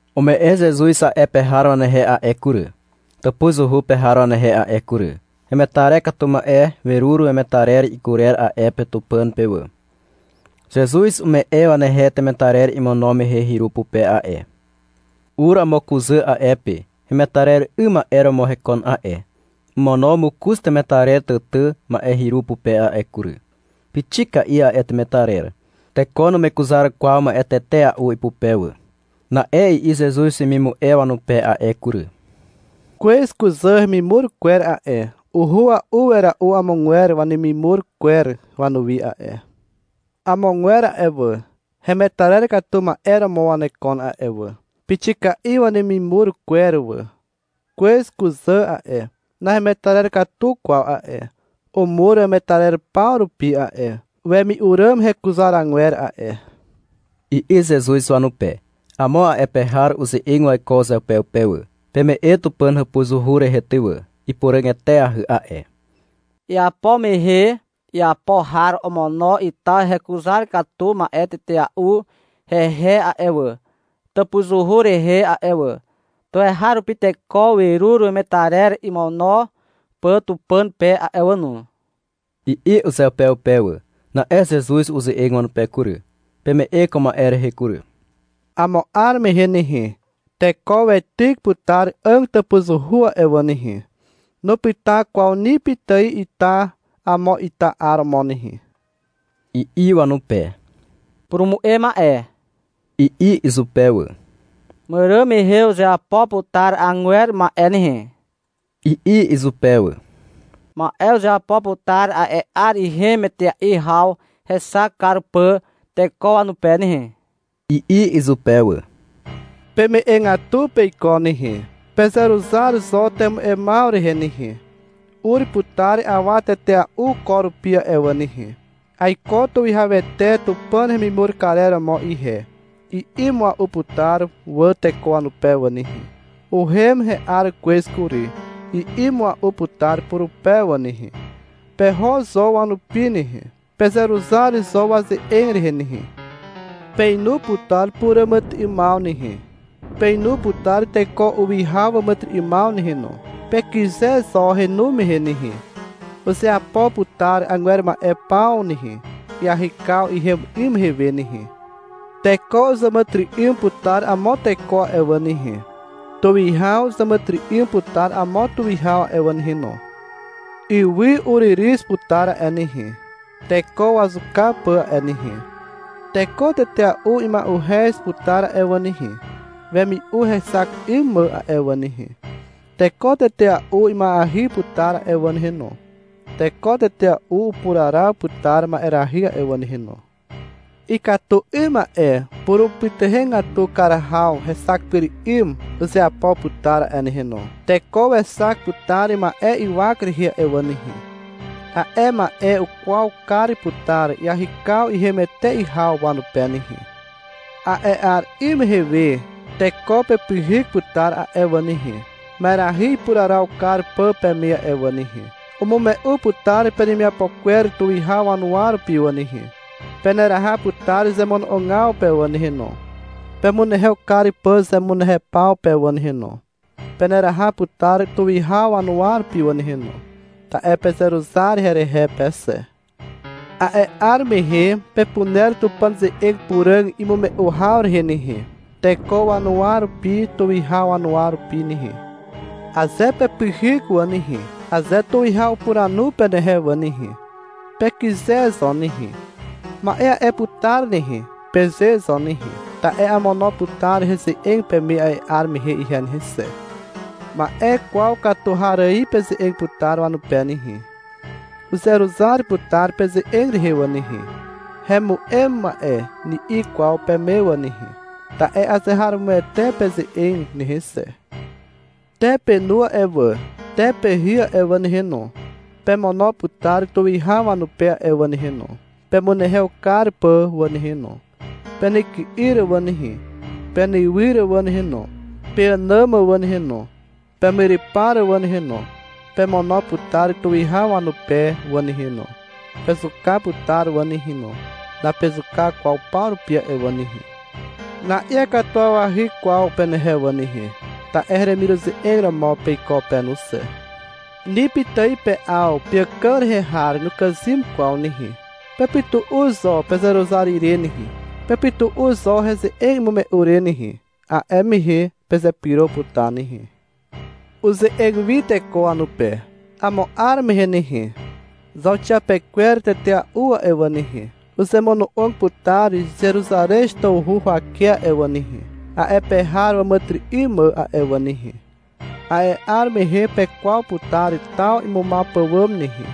Ume'e Zezuz a'e pe har wanehe a'e kury, tàpuzuhu pe har wanehe a'e kury. Hemetarer katu ma'e werur wemetarer ikurer a'e pe Tupàn pe wà. Zezuz ume'e wanehe temetarer imono mehe hyru pupe a'e. Ur amo kuzà a'e pe. Hemetarer 'ym ma'e romo hekon a'e. Omono mokoz temetarer tàtà ma'e hyru pupe a'e kury. Pixika'i a'e temetarer. (Teko numekuzar kwaw ma'e tetea'u ipupe wà.) Na'e i'i Zezuz wemimu'e wanupe a'e kury. — Kwez kuzà hemimur kwer a'e, uhua'u wera'u amogwer wanemimur kwer wanuwi a'e. Amogwer a'e wà, hemetarer katu ma'e romo wanekon a'e wà, pixika'i wanemimur kwer wà. Kwez kuzà a'e, nahemetarer katu kwaw a'e. Umur wemetarer paw rupi a'e, wemi'u ràm hekuzaragwer a'e, i'i Zezuz wanupe. Amo a'e pe har uze'eg waiko uzeupeupe wà. — Peme'e Tupàn hàpuzuhu rehe ty wà, ipuràg eteahy a'e. Iapo mehe iapo har omono ita hekuzar katu ma'e tetea'u hehe a'e wà, tàpuzuhu rehe a'e wà. Tuweharupi teko werur wemetarer imono pà Tupàn pe a'e wà no, i'i uzeupeupe wà. Na'e Zezuz uze'eg wanupe kury. — Peme'e ko ma'e rehe kury. Amo 'ar mehe nehe, teko weityk putar 'àg tàpuzuhu a'e wà nehe. Nupyta kwaw ni pitài ita amo ita 'ar romo nehe, i'i wanupe. — Purumu'e ma'e, i'i izupe wà. — Màràn mehe uzeapo putar agwer ma'e nehe, i'i izupe wà. — Ma'e uzeapo putar a'e 'ar ihem etea'i haw hexak kar pà teko wanupe nehe, i'i izupe wà. — Peme'egatu peiko nehe. Pezeruzar zo temu'emaw rehe nehe. Ur putar awa tetea'u ko rupi a'e wà nehe. — Aiko tuwihawete Tupàn hemimur karer romo ihe, i'i mua'u putar wà teko wanupe wà nehe. — Uhem he'ar kwez kury, i'i mua'u putar purupe wà nehe. Peho zo wanupi nehe, pezeruzar zo waze'eg rehe nehe. Peinu putar puràmàtyry'ymaw nehe, peinu putar teko uwihaw waàmàtyry'ymaw nehe no. Pekyze zo henu mehe nehe. Uzeapo putar 'agwer ma'e paw nehe, iahykaw ihem 'ym mehe we nehe. Teko uzàmàtyry'ym putar amo teko a'e wà nehe. Tuwihaw uzàmàtyry'ym putar amo tuwihaw a'e wà nehe no. Ywy uryryz putar a'e nehe, (teko wazuka pà) a'e nehe. Teko tetea'u ima'uhez putar a'e wà nehe, wemi'u hexak 'ym mà a'e wà nehe. Teko tetea'u ima'eahy putar a'e wà nehe no. Teko tetea'u upuraraw putar ma'erahy a'e wà nehe no. Ikatu 'ym ma'e purumupytuhegatu kar haw hexak pyr 'ym uzeapo putar a'e nehe no. Teko wexak putar ma'e ywak rehe a'e wà nehe. A'e ma'e ukwaw kar putar iahykaw ihem etea'i haw wanupe nehe. A'e 'ar 'ym mehe we, teko pepyhyk putar a'e wà nehe, ma'erahy ipuraraw kar pà peme a'e wà nehe. Umume'u putar penemiapo kwer tuwihaw wanuwa rupi wà nehe. Peneraha putar zemono'ogaw pe wà nehe no, pemunehew kar pà zemunehew paw pe wà nehe no. Peneraha putar tuwihaw wanuwa rupi wà nehe no, ta'e pezeruzar herehe pe xe. A'e 'ar mehe pepuner Tupàn ze'eg puràg imume'u haw rehe nehe, teko wanuwa rupi tuwihaw wanuwa rupi nehe. Aze pepyhyk wà nehe, aze tuwihaw upuranu penehe wà nehe, pekyze zo nehe. — Ma'e a'e putar nehe, peze zo nehe. Ta'e amono putar heze'eg peme a'e 'ar mehe ihe nehe xe. Ma'e kwaw katu har ài peze'eg putar wanupe nehe. Uzeruzar putar peze'eg rehe wà nehe. — Hemu'em ma'e, ni'i kwaw peme wà nehe, ta'e azeharomoete peze'eg nehe xe. — Te penu a'e wà, te pehy a'e wà nehe no, pemono putar tuwihaw wanupe a'e wà nehe no, pemunehew kar pà wà nehe no. Penyky'yr wà nehe, penywyr wà nehe no, peànàm wà nehe no, pemyrypar wà nehe no, pemono putar tuwihaw wanupe wà nehe no. Pezuka putar wà nehe no. Napezuka kwaw paw rupi a'e wà nehe. Na'iakatuwawahy kwaw penehe wà nehe, ta'e heremiruze'eg romo peiko pe no xe. Ni pitài pe'aw peàkàg rehe har nukàzym kwaw nehe. Pepytu'u zo pezeruzar ire nehe. Pepytu'u zo heze'eg imume'u re nehe. A'e mehe pezepyro putar nehe. Uze'eg wi teko wanupe. — Amo 'ar mehe nehe, zauxiapekwer tetea'u a'e wà nehe, uzemono'og putar Zeruzarez tawhu huwake a'e wà nehe, a'e pe har wàmàtyry'ym mà a'e wà nehe. A'e 'ar mehe pekwaw putar taw imumaw pàwàm nehe.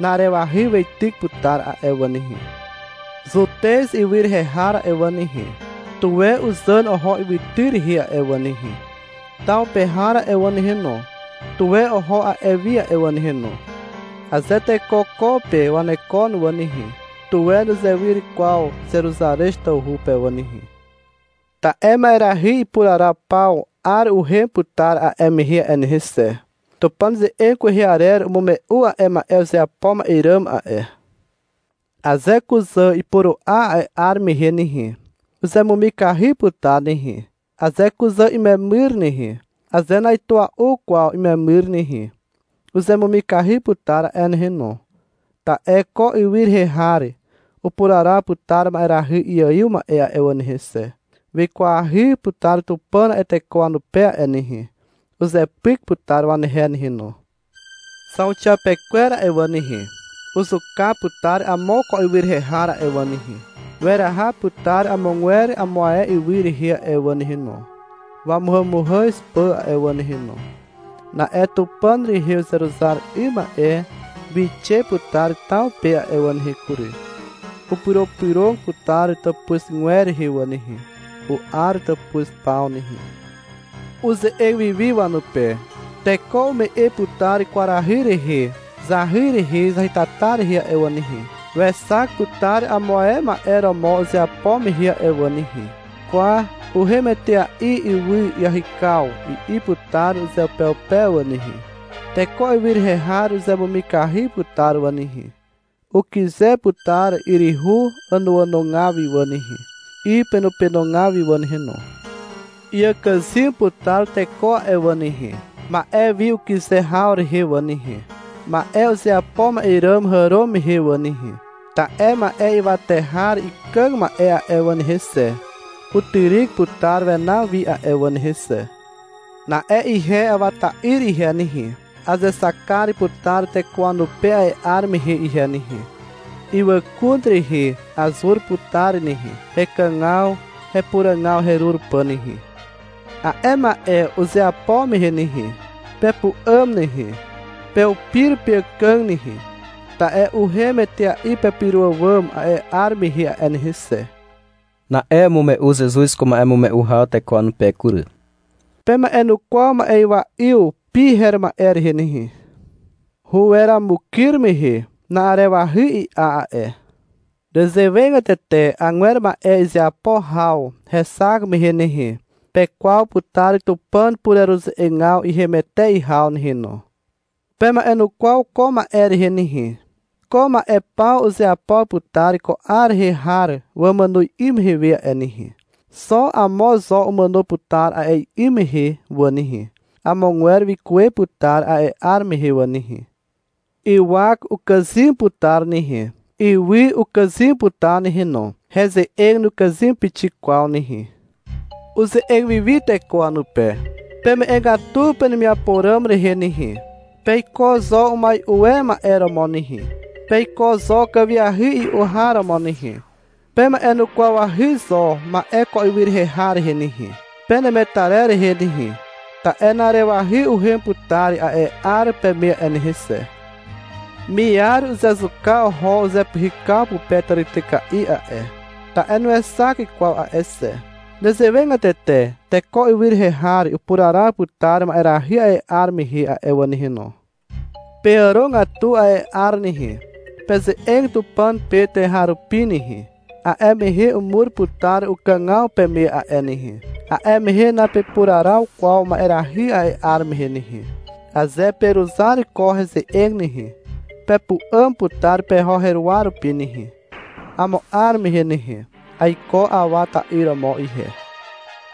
Na'arewahy weityk putar a'e wà nehe. Zutez ywy rehe har a'e wà nehe, tuwe uzàn oho ywytyr rehe a'e wà nehe. Taw pe har a'e wà nehe no, tuwe oho a'e wi a'e wà nehe no. Aze teko ko pe wanekon wà nehe, tuwe nuzewyr kwaw Zeruzarez tawhu pe wà nehe. Ta'e ma'erahy ipuraraw paw 'ar uhem putar a'e mehe a'e nehe xe. Tupàn ze'eg kwehe arer umume'u a'e ma'e uzeapo ma'e ràm a'e. Aze kuzà ipuru'a a'e 'ar mehe nehe, uzemumikahy putar nehe. Aze kuzà imemyr nehe, aze na'itua'u kwaw imemyr nehe, uzemumikahy putar a'e nehe no. Ta'e ko ywy rehe har upuraraw putar ma'erahy iaiw ma'e a'e wà nehe xe. Wikwahy putar Tupàn a'e teko wanupe a'e nehe. Uzepyk putar wanehe nehe no. Zauxiapekwer a'e wà nehe, uzuka putar amo ko ywy rehe har a'e wà nehe, weraha putar amogwer amo ae ywy rehe a'e wà nehe no, wamuhàmuhàz pà a'e wà nehe no. Na'e Tupàn rehe uzeruzar 'ym ma'e wixe putar taw pe a'e wà nehe kury. Upyropyrog putar tàpuzgwer rehe wà nehe, u'ar tàpuz paw nehe. Uze'eg wiwi wanupe. — Teko ume'e putar kwarahy rehe zahy rehe zahytata rehe a'e wà nehe, wexak putar amo ae ma'e romo uzeapo mehe a'e wà nehe. — Kwa, uhem etea'i ywy iahykaw, i'i putar uzeupeupe wà nehe. Teko ywy rehe har uzemumikahy putar wà nehe, ukyze putar yryhu ànoànogaw wi wà nehe, 'y penopenogaw wi wà nehe no. Iàkàzym putar teko a'e wà nehe, ma'e wi ukyze haw rehe wà nehe, ma'e uzeapo ma'e ràm hàro mehe wà nehe. Ta'e ma'e ywate har ikàg ma'e a'e wà nehe xe, utyryk putar wenaw wi a'e wà nehe xe. Na'e ihe Awa ta'yr ihe nehe, azexak kar putar teko wanupe a'e 'ar mehe ihe nehe. Ywàkun rehe azur putar nehe, hekàgaw hepuràgaw herur pà nehe. A'e ma'e uzeapo mehe nehe, pepu'àm nehe, peupir peàkàg nehe, ta'e uhem etea'i pepyro àwàm a'e 'ar mehe a'e nehe xe. Na'e umume'u Zezuz ko ma'emume'u haw teko wanupe kury. — Pema'enukwaw ma'ywa 'yw pi her ma'e rehe nehe. Huweramukyr mehe, na'arewahy i'a a'e. Nezewegatete agwer ma'e izeapo haw hexak mehe nehe, pekwaw putar Tupàn pureruze'egaw ihem etea'i haw nehe no. Pema'enukwaw ko ma'e rehe nehe. Ko ma'e paw uzeapo putar ko 'ar rehe har wamàno 'ym mehe we a'e nehe. Xo amo zo umàno putar a'e 'ym mehe wà nehe. Amogwer wikuwe putar a'e 'ar mehe wà nehe. Ywak ukàzym putar nehe. Ywy ukàzym putar nehe no. Heze'eg nukàzym pixik kwaw nehe. Uze'eg wiwi teko wanupe. — Peme'egatu penemiapo ràm rehe nehe. Peiko zo umai'u e ma'e romo nehe, peiko zo kàwiahy i'u har romo nehe. Pema'enukwawahy zo ma'e ko ywy rehe har rehe nehe, penemetarer rehe nehe. Ta'e na'arewahy uhem putar a'e 'ar peme a'e nehe xe. Miar uzezuka oho uzepyhykaw pupe tàrityka'i a'e, ta'e nuexak kwaw a'e xe. Nezewegatete teko ywy rehe har upuraraw putar ma'erahy a'e 'ar mehe a'e wà nehe no. Peàrogatu a'e 'ar nehe. Peze'eg Tupàn pe tuweharupi nehe. A'e mehe umur putar ukàgaw peme a'e nehe. A'e mehe napepuraraw kwaw ma'erahy a'e 'ar mehe nehe. Aze peruzar ko heze'eg nehe, pepu'àm putar peho heruwa rupi nehe, amo 'ar mehe nehe. Aiko Awa ta'yr romo ihe.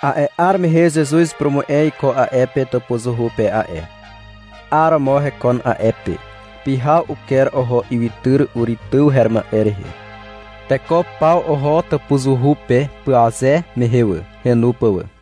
A'e 'ar mehe Zezuz upurumu'e iko a'e pe tàpuzuhu pe a'e. 'Aromo hekon a'e pe. Pyhaw uker oho ywytyr Uri tyw her ma'e rehe. Teko paw oho Tàpuzuhu pe pyaze mehe wà, henu pà wà.